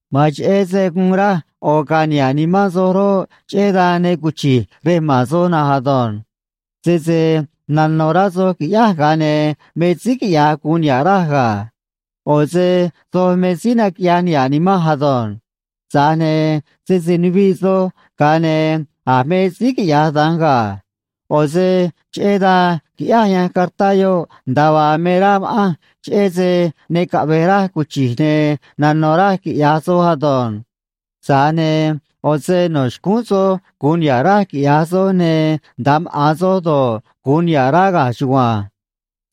Ma̱an cheꞌé se guun raj ꞌo̱ ga̱a̱ niha̱ꞌ nimán soj roꞌ, cheꞌé dan ne cuchi̱j rej ma̱n soj na̱nj ado̱nj. Sese nano̱ rá soj qui̱ꞌyáj, ga̱a ne̱ me síí quiꞌya̱j gu̱un niha̱ꞌ raj ga̱. ꞌO̱ se soj me síí naquiꞌyaj niha̱ꞌ nimanj ado̱nj. Tza̱j ne̱ sese nuviꞌ soj, ga̱a ne̱ a̱ me síí quiꞌya̱j da̱nj ga̱. ꞌO̱ se cheꞌé dan quiꞌyáj yanj cartá yoꞌ, nda̱a vaa me rá ma̱ꞌanj, cheꞌé se ne caꞌve̱j raj cuchi̱j ne̱ nano̱ raj quiꞌya̱j soj ado̱nj. Tza̱j ne̱ ꞌo̱ se no̱ xcúún soj gu̱un niha̱ꞌ raj quiꞌya̱j soj, ne̱ nda̱a maꞌa̱n soj do̱ꞌ, gu̱un niha̱ꞌ rá ga̱a chugua̱nj.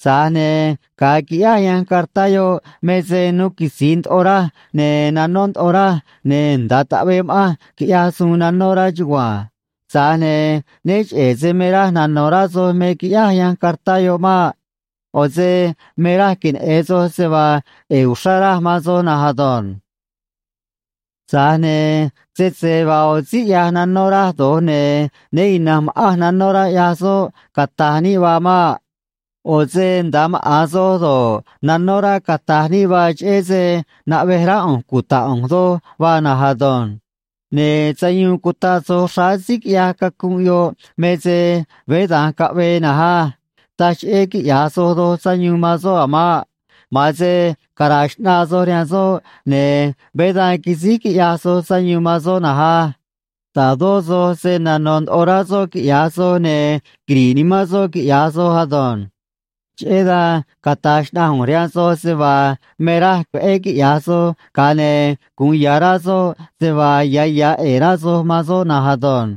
Tza̱j ne̱ ga̱a quiꞌyáj yanj cartá yoꞌ me se nuu quitzi̱i ndoꞌo raj, ne̱ nanó ndoꞌo raj, ne̱ nda̱a taꞌvee ma̱ꞌanj, quiꞌyaj suun nanó rá chugua̱nj. Tza̱j ne̱ né cheꞌe̱ se me raj nano̱ rá soj me quiꞌyáj yanj cartá yoꞌ maꞌ. ꞌO̱ se me raj queneꞌe̱n soj se vaa ꞌe̱e̱ uxrá raj man soj na̱nj ado̱nj. Tza̱j ne̱ sese vaa ꞌo̱ síí ꞌyaj nanó raj do̱j, ne̱ né ina̱nj ma̱ꞌanj nanó rá ꞌyaj soꞌ, cata̱j níꞌ vaa maꞌ. ꞌO̱ se nda̱a maꞌa̱n soj do̱ꞌ, nanó rá, cata̱j níꞌ vaa, cheꞌé se naꞌvej rá ꞌu̱nj cuta̱ꞌ ꞌu̱nj doj vaa na̱nj ado̱nj. Ne̱ sayuun cutaꞌ soj xráá síí quiꞌyaj cacunꞌ yoꞌ me se veé dan caꞌvee na̱nj á. Taj cheꞌé quiꞌya̱j soj doj sayuun man soꞌ a̱ maꞌ. Ma̱an se cara̱a̱ xꞌnaa soj rihaan soꞌ, ne̱ veé dan quisíj quiꞌyaj soj sayuun man soꞌ na̱nj á. Ta̱dó soj se̱ nanó ndoꞌo rá soꞌ, quiꞌya̱j soj, ne̱ quiri̱ꞌ nimán soꞌ, quiꞌya̱j soj ado̱nj. Cheꞌé dan cata̱j xnaꞌanj ꞌu̱nj rihaan soj se vaa me raj veꞌé quiꞌya̱j soj, ga̱a ne̱ gu̱un ya̱ rá soꞌ se vaa ya̱ ya̱ ꞌe̱e̱ rá soj man soꞌ na̱nj ado̱nj.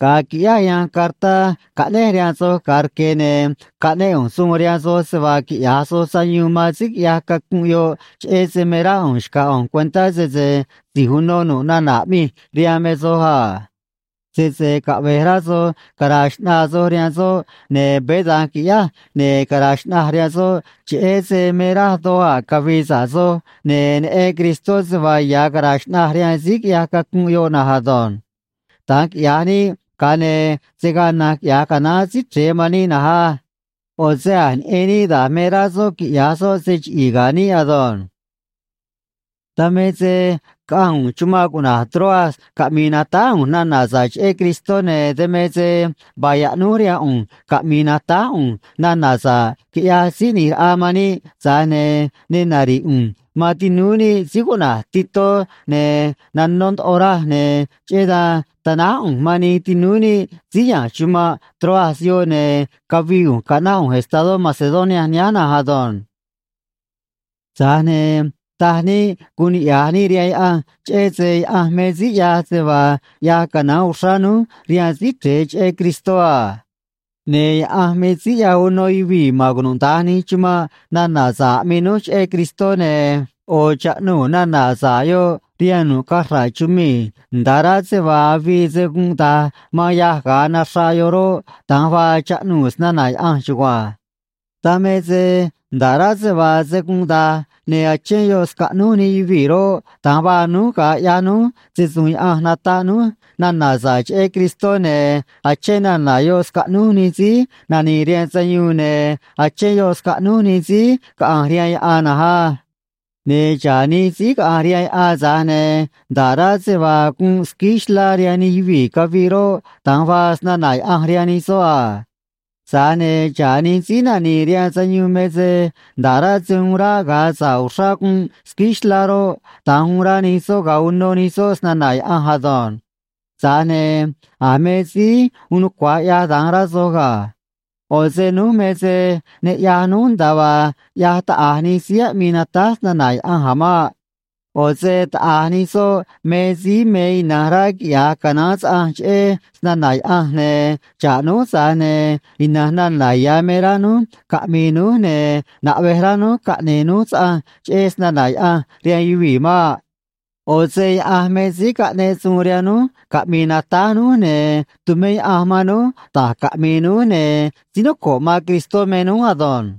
Ga̱a quiꞌyáj yanj cartá caꞌnéj rihaan soj ga̱a rque̱, ne̱ caꞌnéꞌ ꞌu̱nj suun rihaan soj se vaa quiꞌya̱j soj sayuun man síí quiꞌyaj cacunꞌ yoꞌ, cheꞌé se me rá ꞌu̱nj xca̱j ꞌu̱nj cuentá sese si̱j uno nu̱ꞌ nana̱ aꞌmij rihaan me soj a. Sese caꞌve̱j rá soj cara̱a̱ xꞌnaa soj rihaan soꞌ, ne̱ veé da̱nj qui̱ꞌyáj, ne̱ cara̱a̱ xꞌnaj rihaan soꞌ, cheꞌé se me raj doj a̱ cavi̱i̱ sa̱ꞌ soj, ne̱ neꞌen Cristó se vaa ya̱ caraa xꞌnaj rihaan síí quiꞌyaj cacunꞌ yoꞌ na̱nj ado̱nj. Da̱nj quiꞌya̱j níꞌ, ga̱a ne̱ se̱ gaa na̱nj quiꞌya̱j canaán Síí Chre̱e man níꞌ na̱nj á. ꞌO̱ se a̱j neꞌen níꞌ da̱j me rá soꞌ quiꞌya̱j soꞌ se chiꞌi̱i̱ ga̱ níꞌ ado̱nj. Dan me se caꞌanj ꞌu̱nj chumanꞌ cuꞌna̱j Troas caꞌmi̱i̱ natáj ꞌu̱nj nana̱ sa̱ꞌ cheꞌé Cristó, ne̱ dan me se vaa yaꞌnúj rihaan ꞌu̱nj caꞌmi̱i̱ natáj ꞌu̱nj nana̱ sa̱ꞌ, quiꞌyaj Síí ꞌNi̱j Raꞌa man níꞌ, tza̱j ne̱ ne nari̱ꞌ ꞌu̱nj man tinúú níꞌ síí cuꞌna̱j Titó, ne̱ nanó ndoꞌo raj, ne̱ cheꞌé dan tanáj ꞌu̱nj man nij tinúú níꞌ síí ya̱nj chumanꞌ Troas yoꞌ, ne̱ cavii ꞌu̱nj caꞌnáꞌ ꞌu̱nj estadó Macedonia nihánj na̱nj ado̱nj. Tza̱j ne̱ taj níꞌ guun niꞌya̱j níꞌ rihaan Yaꞌanj, cheꞌé se Yaꞌanj me síí ꞌyaj se vaa ꞌyaj canaán uxrá núj rihaan Síí Chre̱e cheꞌé Cristó a. Ne̱ Yaꞌanj me síí ꞌyaj uno yuvii̱ ma̱n cunuda̱nj nij chumanꞌ nana̱ sa̱ꞌ aꞌmii núj cheꞌé Cristó, ne̱ ꞌo̱ chaꞌnuu̱ nana̱ sa̱ꞌ yoꞌ rihaan nu̱ꞌ cachra̱ꞌ chumii̱, nda̱ꞌ rá se vaa avii se gunꞌ da̱j man yâj ga̱a naxraꞌ yoꞌ roꞌ, da̱nj vaa chaꞌnuu̱ snana̱ Yaꞌanj chugua̱nj. Dan me se nda̱ꞌ rá se vaa se gunꞌ da̱j, ne̱ achén yoꞌ scaꞌnúj nij yuvii̱ roꞌ, da̱nj vaa núj ga̱a ꞌyaj núj se‑su̱u̱n Yaꞌanj nataꞌ núj nana̱ sa̱ꞌ cheꞌé Cristó, ne̱ achén nana̱ yoꞌ scaꞌnúj nij síí nani̱i̱ rihaan sayuun, ne̱ achén yoꞌ scaꞌnúj nij síí caꞌa̱nj rihaan yaꞌan na̱nj á. Ne̱ xa̱ꞌ nij síí caꞌa̱nj rihaan yaꞌan, tza̱j ne̱ nda̱ꞌ rá se vaa gunꞌ squíí xlá rihaan nij yuvii̱ caviꞌ roꞌ, da̱nj vaa snana̱ Yaꞌanj rihaan nij soꞌ a. Tza̱j ne̱ xa̱ꞌ nij síí nani̱i̱ rihaan sayuun me se nda̱ꞌ rá se uun ráꞌ ga̱a sa̱ꞌ uxrá gunꞌ squíí xlá roꞌ, da̱nj uun rá nij soꞌ ga̱a uno nij soꞌ snana̱ Yaꞌanj ado̱nj. Tza̱j ne̱ a̱ me síí uun nucua̱j ꞌyaj da̱nj, rá soj ga̱. ꞌO̱ se núj me se ne ꞌyaj núj nda̱a vaa ꞌyaj taꞌa̱j nij síí aꞌmii natáj snana̱ Yaꞌanj a̱ maꞌ. ꞌO̱ se taꞌa̱j nij soꞌ me síí me ina̱nj rá quiꞌya̱j canaán saꞌanj cheꞌé snana̱ Yaꞌanj, ne̱ xa̱ꞌ núj, tza̱j ne̱ ina̱nj nana̱ ya̱ me rá núj caꞌmi̱i̱ núj, ne̱ naꞌvej rá núj caꞌne̱e̱ núj saꞌanj cheꞌé snana̱ Yaꞌanj rihaan yuvii̱ maꞌ. ꞌO̱ se Yaꞌanj me síí caꞌneꞌ suun rihaan núj caꞌmi̱i̱ natáj núj, ne̱ tumé Yaꞌanj man núj da̱j caꞌmi̱i̱ núj, ne̱ síí noco̱ꞌ man Cristó me núj ado̱nj.